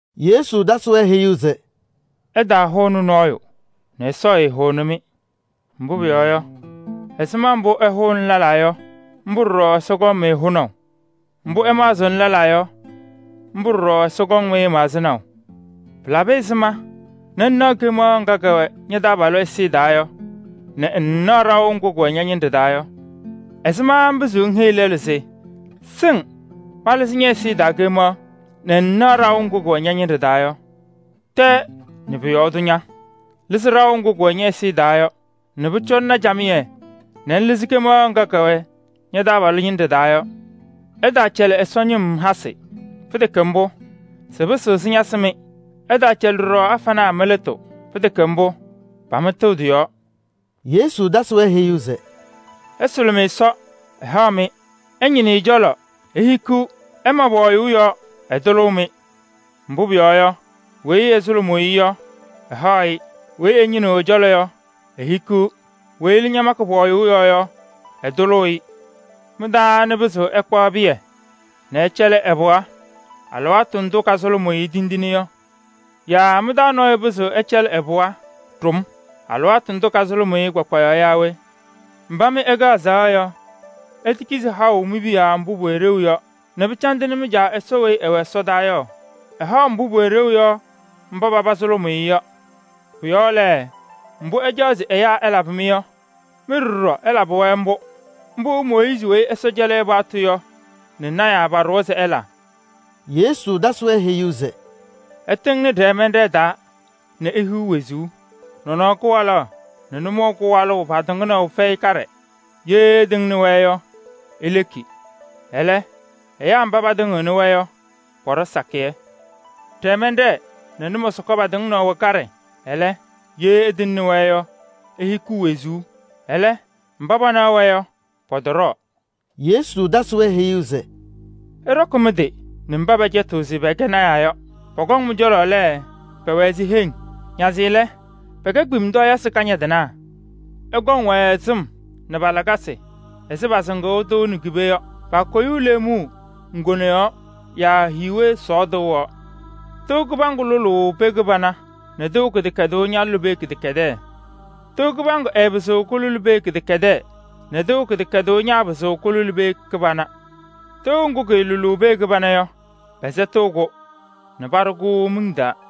Yesu tasɩ-wɛ heyuu se: “Ɩtaahʋnɩ nɔɔyʋ nɛ Ɛsɔ ɛtaahʋnɩ-mɩ. Mbʋ pʋyɔɔ yɔ, ɛzɩma mbʋ ɩhʋʋnɩ lɛlaa yɔ, mbʋ ɖɔɖɔ Ɛsɔ kɔŋ-mɩ hʋnaʋ. Mbʋ ɩmaɣzɩɣnɩ lɛlaa yɔ, mbʋ ɖɔɖɔ Ɛsɔ kɔŋ-mɩ maɣzɩnaʋ. Pɩlabɩ ɛzɩma nɛ ŋnaɣ kemaɣ ŋga kɛwɛ ña-taabalʋ ɛzɩyɛ taa yɔ nɛ ŋŋnaɣ ɖaʋ ŋgʋ kʋwɛ ña-ñɩnɖɛ taa yɔ? Ɛzɩma ŋpɩzɩɣ ŋheyi lɛlʋ se: ‘Sɩŋ malɩzɩ ñɛ-ɛzɩyɛ taa kemaɣ’ nɛ ŋŋnaɣ ɖaʋ ŋgʋ kʋwɛ ña-ñɩnɖɛ taa yɔ? Tɛɛ nɛ pʋ-yɔɔ tʋ ña! Lɩzɩ ɖaʋ ŋgʋ kʋwɛ ñɛ-ɛzɩyɛ taa yɔ nɛ pʋcɔ ŋna camɩyɛ nɛ ŋlɩzɩ kemaɣ ŋga kɛwɛ ña-taabalʋ ñɩnɖɛ taa yɔ. “Ɩtaacɛlɩ Ɛsɔ ñɩm hasɩ. Pɩtɛkɛ mbʋ, sɩpɩsɩɣ sɩñasɩ-mɩ. Ɩtaacɛlɩ ɖɔɖɔ afanaa mɩ-lɩtʋ. Pɩtɛkɛ mbʋ, pamɩtɩɣ tɩ-yɔɔ.” Yesu tasɩ-wɛ heyuu se: “Ɩsʋlʋmɩ Ɛsɔ, ɛhaɣ-mɩ, ɩñɩnɩ ɛ-cɔlɔ, ihikiɣ, ɩma pɔɔyʋʋ yɔɔ, ɛtʋlʋʋ-mɩ. Mbʋ pʋyɔɔ yɔ, weyi ɛsʋlʋmʋʋ-ɩ yɔ, ɛhaɣ-ɩ, weyi ɛñɩnɩɣ ɛ-cɔlɔ yɔ, ehikiɣ, weyi ɛlɛ makɩ pɔɔyʋʋ yɔɔ yɔ, ɛtʋlʋʋ-ɩ. Mɩ-taa anɩ pɩzɩɣ ɛkpaɣ pɩyɛ nɛ ɛcɛlɩ ɛ-pɩɣa alɩwaatʋ ndʋ kasʋlʋmʋʋ-ɩ tindine yɔ? Yaa mɩ-taa nɔɔyʋ pɩzɩɣ ɛcɛlɩ ɛ-pɩɣa ɖʋm alɩwaatʋ ndʋ kasʋlʋmʋʋ-ɩ kpakpayaɣ yɔ yaa we? Mba mɩ ɩkɛ azaɣa yɔ, itekizi haʋ mi-piya mbʋ pʋwɛ ɖeu yɔ nɛ pɩcandɩnɩ mɩ-Caa Ɛsɔ weyi ɛwɛ ɛsɔdaa yɔ? Ɛhaɣ mbʋ pʋwɛ ɖeu yɔ mba paba sʋlʋmʋʋ-ɩ yɔ. Pʋ-yɔɔ lɛ, mbʋ ɩcaɣ se ɛyaa ɛlabɩ-mɩ yɔ, mɩ ɖɔɖɔ ɩlabɩ-wɛ mbʋ. Mbʋ Mooyiizi weyi Ɛsɔ cɛlɩ paɣtʋ yɔ nɛ lɔɔyɩsɩ tɩnaa paɖʋwa se ɩla.” Yesu tasɩ-wɛ heyuu se: “Ɩtɩŋnɩ ɖɛɛmɛnɖɛɛ taa nɛ ihiɣ wezuu. Nɔnɔɔ kɩwalaɣ nɛ nʋmɔʋ kɩwalʋʋ patɩŋnaʋ fɛyɩ kaɖɛ, ye ɩtɩŋnɩ-wɛ yɔ, ileki. Ɛlɛ, ɛyaa mba patɩŋɩɣnɩ-wɛ yɔ pɔɖɔ sakɩyɛ. Ɖɛɛmɛnɖɛɛ nɛ nʋmɔsɔka patɩŋnaʋ wɛ kaɖɛ, ɛlɛ, ye ɩtɩŋnɩ-wɛ yɔ, ihikiɣ wezuu. Ɛlɛ, mba panaɣ-wɛ yɔ, pɔtɔɖɔɔ.” Yesu tasɩ-wɛ heyuu se: “Ɩɖɔkɩ mɩ-tɩ nɛ mba pɛcɛtɩɣ se pɛkɛ lɔɔyɩsɩ tɩnaa yɔ. Pɔkɔŋ mɩ-cɔlɔ lɛ, pɛwɛ ɛzɩ heŋ, nazɩ lɛ, pɛkɛ kpemtɔɔyɩsɩ kañadɩnaa. Ɩkɔŋ-wɛ sɩm nɛ pa-lakasɩ ɛzɩ pasɩŋʋʋ tɩʋ nɛ ki-pee yɔ. Paakoyuu leemuu ŋgone yɔɔ yaa hiiwe sɔɔ tɩʋ yɔɔ. Tɩʋ kɩbaŋgʋ lʋlʋʋ pee kɩbana nɛ tɩʋ kɩdɛkɛdʋʋ ñalʋlɩ pee kɩdɛkɛdɛɛ. Tɩʋ kɩbaŋgʋ ɛɛpɩzɩɣ kʋlʋlɩ pee kɩdɛkɛdɛɛ nɛ tɩʋ kɩdɛkɛdʋʋ ñaapɩzɩɣ kʋlʋlɩ pee kɩbana. Tɩʋ ŋgʋ kɩɩlʋlʋʋ pee kɩbana yɔ, pɛsɛtɩɣ-kʋ nɛ paɖʋ-kʋ miŋ taa.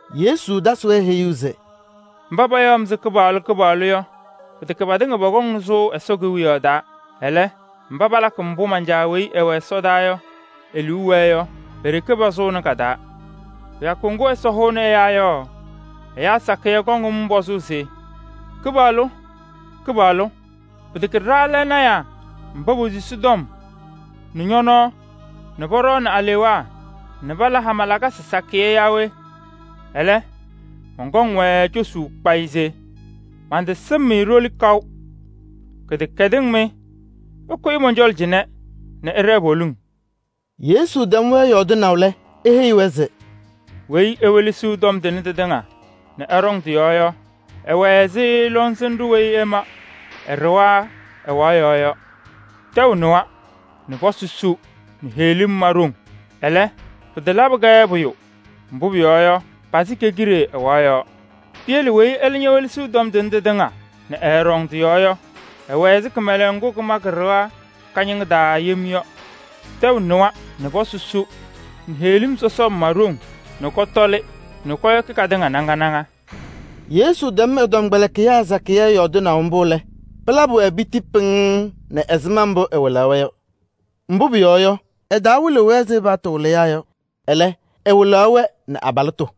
Yesu tasɩ-wɛ heyuu se: “Mba payaɣ-m se: ‘Kɩpaɣlʋ! Kɩpaɣlʋ!’ yɔ pɩtɛkɛ patɩŋa pɔkɔŋnɩ sʋʋ Ɛsɔ Kewiyaɣ taa. Ɛlɛ, mba palakɩ mbʋ man-Caa weyi ɛwɛ ɛsɔdaa yɔ e-liu wɛɛ yɔ, pe-ɖeke pasʋʋnɩ ka-taa. Kɩyakʋ ŋgʋ Ɛsɔ hʋʋnɩ ɛyaa yɔ, ɛyaa sakɩyɛ kɔŋ-m pɔzʋʋ se: ‘Kɩpaɣlʋ! Kɩpaɣlʋ! Pɩtɛkɛ ɖa lɛ lɔɔyɩsɩ tɩnaa mba posusi tɔm nɛ ñɔ-nɔɔ nɛ pɔɖɔɔnɩ alewaa nɛ pala hama lakasɩ sakɩyɛ yɔ yaa we?’ Ɛlɛ, mɔnkɔŋ-wɛ cosuu kpayɩ se: ‘Mantasɩm-mɩ ɖoli kaʋ. Kɩdɛkɛdɩŋ mɩ! Ɩkʋyɩ mɔn-cɔlɔ cɩnɛ nɛ ɩɖɛɛ poliŋ.’” Yesu tɛm-wɛ yɔɔdɩnaʋ lɛ, eheyi-wɛ se: “Weyi ewelesiɣ tɔm tʋnɛ tɩtɩŋa nɛ ɛɖɔŋ tɩ-yɔɔ yɔ, ɛwɛ ɛzɩ lɔŋsɩnɖʋ weyi ɛma ɛ-ɖɩɣa ɛwaɣ yɔɔ yɔ. Tɛʋ nɩwa nɛ pɔsɩ su nɛ heɣlim ma ɖoŋ. Ɛlɛ, pɩtalabɩ-kɛ pʋyʋ, mbʋ pʋyɔɔ yɔ, pasɩ ke-kide ɛwaɣ yɔɔ. Piyele weyi ɛlɛ welesiɣ tɔm tʋnɛ tɩtɩŋa nɛ ɛɛɖɔŋ tɩ-yɔɔ yɔ, ɛwɛ ɛzɩ kɩmɛlɛŋ ŋgʋ kɩma kɩ-ɖɩɣa kañɩŋa taa yem yɔ. Tɛʋ nɩwa nɛ pɔsɩ su nɛ heɣlim sɔsɔm ma ɖoŋ nɛ kɔtɔlɩ nɛ kɔyɔkɩ katɩŋa naŋa naŋa.” Yesu tɛm ɛ-tɔmkpɛlɩkɩyaa sakɩyɛ yɔɔdɩnaʋ mbʋ lɛ, pɩlabɩ-wɛ piti pɩŋŋ nɛ ɛzɩma mbʋ ɛwɩlaɣ-wɛ yɔ. Mbʋ pʋyɔɔ yɔ, ɛtawɩlɩɣ-wɛ ɛzɩ pa-paɣtʋ wɩlɩyaa yɔ. Ɛlɛ, ɛwɩlaɣ-wɛ nɛ abalɩtʋ.